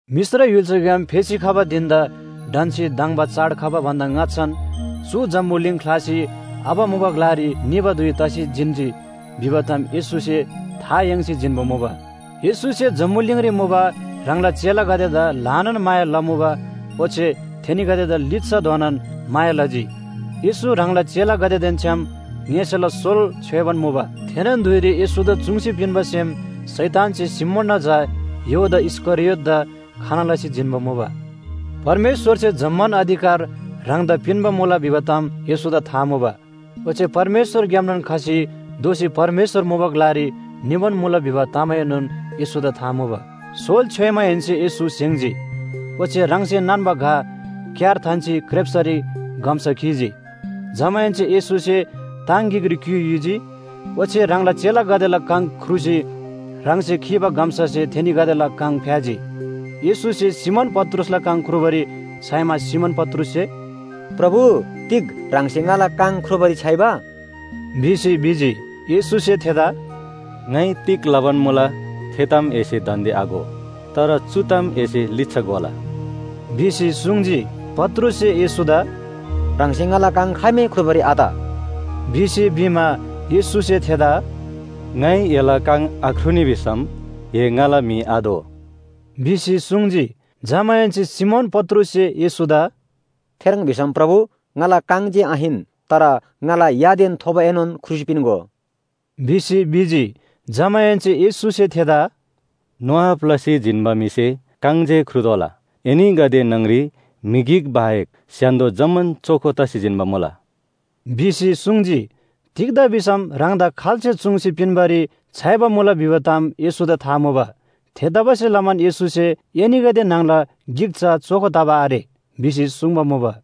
मिश्र य्‍हुल्‍साग्‍याम फेसी खबा धिन‍दा ढन्‍सी धङ्बा चाड खबा भन्‍दा ङाच्‍छान चु जम्‍बुलिङ ख्‍लासी आबा मुबा ग्‍लारी निबा धुइ तसी जिन्‍जी भिबा ताम येशूसे था याङ्सी जिन्‍बा मुबा। येशूसे जम्‍बुलिङरी मुबा ह्राङला चेलागदेदा ल्‍हानान माया लमुबा, ओच्‍छे थेनीगदेदा लिच्‍छाधोनान माया लजी। येशू ह्राङला चेलागदेदेन छ्‌याम ङ्‍यसेला सोल छ्‌योइबान मुबा। थेनोन धुइरी येशूदा चुङ्सी पिन्‍बा सेम शैतानसे सिमोनना झा यहूदा इस्‍करियोतदा खना लसी जिन्‍बा मुबा। परमेश्‍वरसे जम्‍मान अधिकार ह्राङदा पिन्‍बा मुला भिबा ताम येशूदा था मुबा। ओच्‍छे परमेश्‍वरग्‍यामनोन खसी दोःसी परमेश्‍वर मुबा ग्‍लारी निबान मुला भिबा तामएनोन येशूदा था मुबा सोल छ्‍योइमाहेन्‍से येशू स्‍हेङ्‍जी, ओच्‍छे ह्राङसे नान्‍बा घ क्‍यार थान्‍सी क्रेप्‍सरी गम्‍सा खीजी। जमाहेन्‍से येशूसे ताङ गिकरी क्‍युइ युजी, ओच्‍छे ह्राङला चेलागदेला काङ ख्रुसी ह्राङसे खीबा गम्‍सासे थेनीगदेला काङ फ्‍याजी। येशूसे सिमोन पत्रुसला काङ ख्रुबारी छ्‌याइमा सिमोन पत्रुससे “प्रभु तिग ह्राङसे ङाला काङ ख्रुबारी छ्‌याइबा?” भिसी भिजी। येशूसे थेदा “ङाइ तिग लबान मुला, थे ताम एसे दान्‍दे आघो। तर चु ताम एसे लिच्‍छा घोला” भिसी सुङ्जी। पत्रुससे येशूदा “ह्राङसे ङाला काङ खाइमै ख्रुबारी आत” भिसी भिमा, येशूसे थेदा “ङाइ एला काङ आख्रुनी भिसम ए ङाला म्‍हि आदो” भिसी सुङ्जी। जमाहेन्‍से सिमोन पत्रुससे येशूदा “थेह्रङ् भिसम प्रभु, ङाला काङ जे आहिन, तर ङाला यादेन थोबोएनोन ख्रुसी पिन्‍गो” भिसी भिजी। जमाहेन्‍से येशूसे थेदा “नुहाब लसी जिन्‍बा म्‍हिसे काङ जे ख्रुतोःला। एनीगदे न्‍हङ‍री म्‍हि गिक बाहेक स्‍य्‍हान्‍दो जम्‍मान चोखो तसी जिन्‍बा मुला” भिसी सुङ्जी। तिग्‍दा भिसम ह्राङदा खाल्‍से चुङ्सी पिन्‍बारी छ्‌याइबा मुला भिबा ताम येशूदा था मुबा। थेतबासेलमान येशूसे “एनीगदे न्‍हङला गिक चा चोखो तबा आरे” भिसी सुङ्बा मुबा।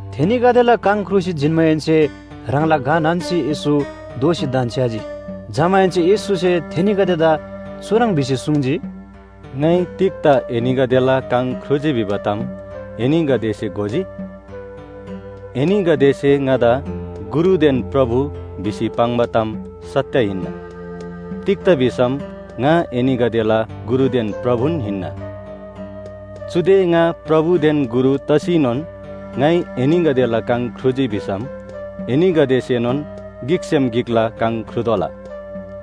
थेनीगदेला काङ ख्रुसी जिन्‍माहेन्‍से ह्राङला घ नान्‍सी येशू दोःसी धन्‍छ्‌याजी। जमाहेन्‍से येशूसे थेनीगदेदा चुह्रङ् भिसी सुङ्जी, “ङाइ तिग्‍दा एनीगदेला काङ ख्रुजी भिबा ताम एनीगदेसे घोजी? एनीगदेसे ङादा ‘गुरुदेन प्रभु’ भिसी पाङ्बा ताम सत्‍य हिन्‍ना, तिग्‍दा भिसम ङा एनीगदेला गुरुदेन प्रभुन हिन्‍ना। चुदे ङा प्रभुदेन गुरु तसीनोन ङाइ एनीगदेला काङ ख्रुजी भिसम एनीगदेसेनोन गिकसेम गिकला काङ ख्रुतोःला।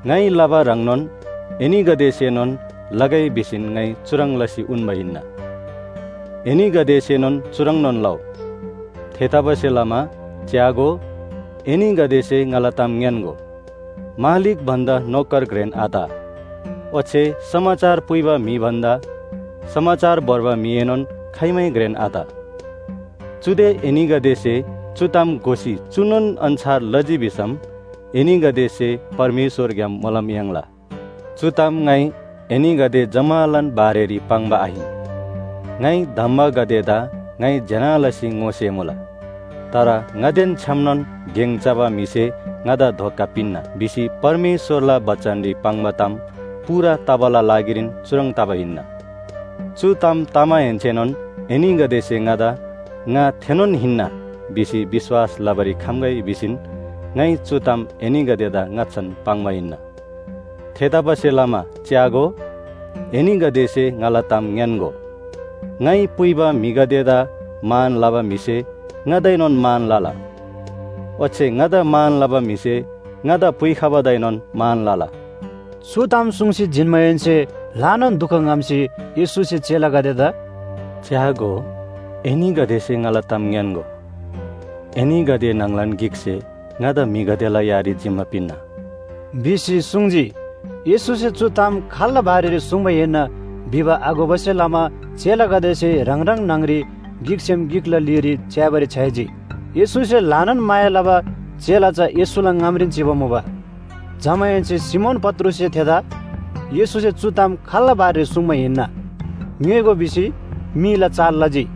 ङाइ लबा ह्रङ्नोन एनीगदेसेनोन लगै भिसीन ङाइ चुह्रङ् लसी उन्‍बा हिन्‍ना। एनीगदेसेनोन चुह्रङ्‌नोन लउ। थेतबासेलमा च्‍यागो, एनीगदेसे ङाला ताम ङ्‌यान्‍गो, मालिक भन्‍दा नोकर घ्रेन आत ओच्‍छे समाचार पुइबा म्‍हि भन्‍दा समाचार भोर्बा म्‍हिएनोन खाइमै घ्रेन आत। चुदे एनीगदेसे चु ताम घोसी चुनोन अन्‍छार लजी भिसम एनीगदेसे परमेश्‍वरग्‍याम मोलम याङ्ला। “चु ताम ङाइ एनीगदे जम्‍मालान बारेरी पाङ्बा आहिन, ङाइ धम्‍बागदेदा ङाइ ज्‍यना लसी ङोसेमुला। तर ‘ङादेन छ्‌यामनोन गेङ चबा म्‍हिसे ङादा धोका पिन्‍ना’ भिसी परमेश्‍वरला बचनरी पाङ्बा ताम पूरा तबाला लागिरीन चुह्रङ् तबा हिन्‍ना। चु ताम तमाहेन्‍सेनोन एनीगदेसे ङादा “ङा थेनोन हिन्‍ना” भिसी विश्‍वास लबारी खम्‍गै भिसीन ङाइ चु ताम एनीगदेदा ङाच्‍छान पाङ्बा हिन्‍ना। थेतबासेलमा च्‍यागो, एनीगदेसे ङाला ताम ङ्‌यान्‍गो, ङाइ पुइबा म्‍हिगदेदा मान लबा म्‍हिसे ङादाएनोन मान लला, ओच्‍छे ङादा मान लबा म्‍हिसे ङादा पुइखबादाएनोन मान लला।” चु ताम सुङ्सी जिन्‍माहेन्‍से ल्‍हानान दुख ङ्‍हम्‍सी येशूसे चेलागदेदा “च्‍यागो, एनीगदेसे ङाला ताम ङ्‌यान्‍गो, एनीगदे न्‍हङलान गिकसे ङादा म्‍हिगदेला यारी जिम्‍मा पिन्‍ना” भिसी सुङ्जी। येशूसे चु ताम खाल्‍ला बारेरी सुङ्बा हिन्‍ना भिबा आघोबासे लमा चेलागदेसे ह्राङ ह्राङ न्‍हङ‍री गिकसेम गिकला लीरी च्‍याबारी छ्‌याइजी। येशूसे ल्‍हानान माया लबा चेला चा येशूला ङामरीन चिबा मुबा। जमाहेन्‍से सिमोन पत्रुससे थेदा “येशूसे चु ताम खाल्‍ला बारेरी सुङ्बा हिन्‍ना? ङ्‌योइगो” भिसी मीला चाल लजी।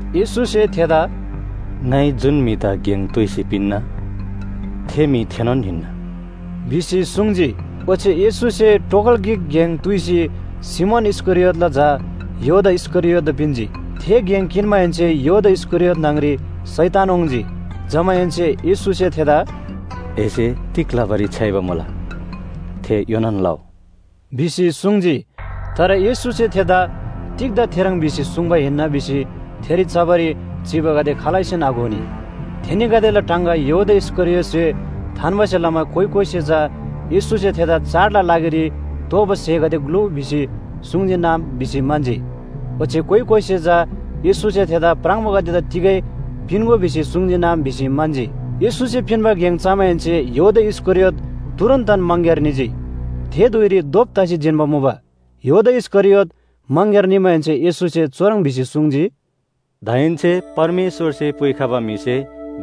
येशूसे थेदा “ङाइ जुन म्‍हिदा गेङ तुइसी पिन्‍ना, थे म्‍हि थेनोन हिन्‍ना” भिसी सुङ्जी। ओच्‍छे येशूसे टोगल गिक गेङ तुइसी सिमोन इस्‍करियोतला झा यहूदा इस्‍करियोतदा पिन्‍जी। थे गेङ किन्‍माहेन्‍से यहूदा इस्‍करियोत न्‍हङ‍री शैतान वाङ्‌जी। जमाहेन्‍से येशूसे थेदा “एसे तिग लबारी छ्‌याइबा मुला, थे योनान लउ” भिसी सुङ्जी। तर येशूसे थेदा तिग्‍दा थेह्रङ् भिसी सुङ्बा हिन्‍ना भिसी थेरी चबारी चिबागदे खालैसेन आघोनी। थेनीगदेला टाङगा यहूदा इस्‍करियोतसे थान्‍बासे लमा कोइ कोइसे चा येशूसे थेदा चाडला लागिरी तोःबा स्‍हेगदे ग्‍लुउ भिसी सुङ्‍जीनम भिसी म्‍हन्‍जी। ओच्‍छे कोइ कोइसे चा येशूसे थेदा प्राङबोगदेदा तिगै पिन्‍गो भिसी सुङ्‍जीनम भिसी म्‍हन्‍जी। येशूसे पिन्‍बा गेङ चमाहेन्‍से यहूदा इस्‍करियोत तुरुन्‍तन मङग्‍यार निजी। थे धुइरी धोप तसी जिन्‍बा मुबा। यहूदा इस्‍करियोत मङग्‍यार निमाहेन्‍से येशूसे चुह्रङ् भिसी सुङ्जी, “दाहेन्‍से परमेश्‍वरसे पुइखबा म्‍हिसे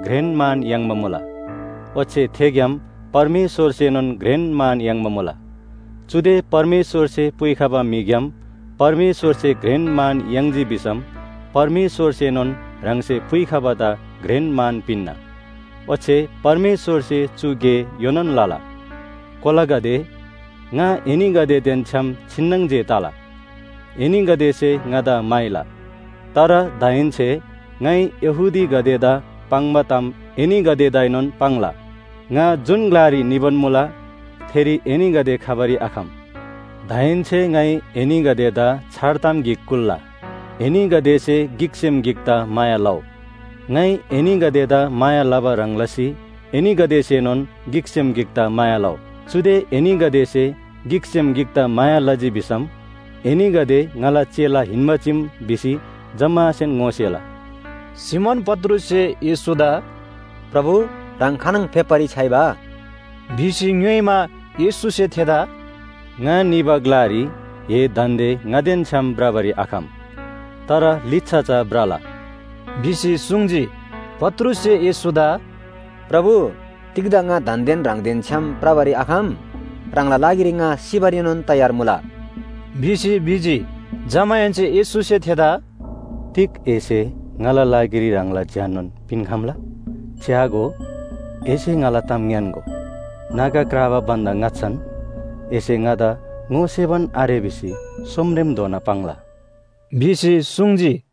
घ्रेन मान याङ्बा मुला, ओच्‍छे थेग्‍याम परमेश्‍वरसेनोन घ्रेन मान याङ्बा मुला। चुदे परमेश्‍वरसे पुइखबा म्‍हिग्‍याम परमेश्‍वरसे घ्रेन मान याङ्जी भिसम परमेश्‍वरसेनोन ह्राङसे पुइखबादा घ्रेन मान पिन्‍ना। ओच्‍छे परमेश्‍वरसे चु गे योनान लला। “कोलागदे, ङा एनीगदेदेन छ्‌याम छिन्‍नङ जे तला। एनीगदेसे ङादा म्‍हाइला, तर दाहेन्‍से ङाइ यहूदीगदेदा पाङ्बा ताम एनीगदेदाएनोन पाङ्ला, ‘ङा जुन ग्‍लारी निबान मुला, थेरी एनीगदे खबारी आखम।’ “दाहेन्‍से ङाइ एनीगदेदा छार ताम गिक कुल्‍ला, एनीगदेसे गिकसेम गिकदा माया लउ। ङाइ एनीगदेदा माया लबा ह्रङ् लसी एनीगदेसेनोन गिकसेम गिकदा माया लउ। चुदे एनीगदेसे गिकसेम गिकदा माया लजी भिसम एनीगदे ङाला चेला हिन्‍बा चीम भिसी जम्‍मासेन ङोसेला।” सिमोन पत्रुससे येशूदा “प्रभु, ह्राङ खानङ फेप्‍बारी छ्‌याइबा?” भिसी ङ्‌योइमा, येशूसे थेदा “ङा निबा ग्‍लारी ए दान्‍दे ङादेन छ्‌याम भ्रबारी आखम, तर लिच्‍छा चा भ्रला” भिसी सुङ्जी। पत्रुससे येशूदा “प्रभु, तिग्‍दा ङा दान्‍देन ह्राङदेन छ्‌याम भ्रबारी आखम? ह्राङला लागिरी ङा सिबारीनोन तयार मुला” भिसी भिजी। जमाहेन्‍से येशूसे थेदा “तिग एसे ङाला लागिरी ह्राङला ज्‍याननोन पिन्‍खम्‍ला? च्‍यागो, एसे ङाला ताम ङ्‌यान्‍गो, नागा क्राबा भन्‍दा ङाच्‍छान एसे ङादा ङोसेबान आरे भिसी सोमरेमधोना पाङ्ला” भिसी सुङ्जी।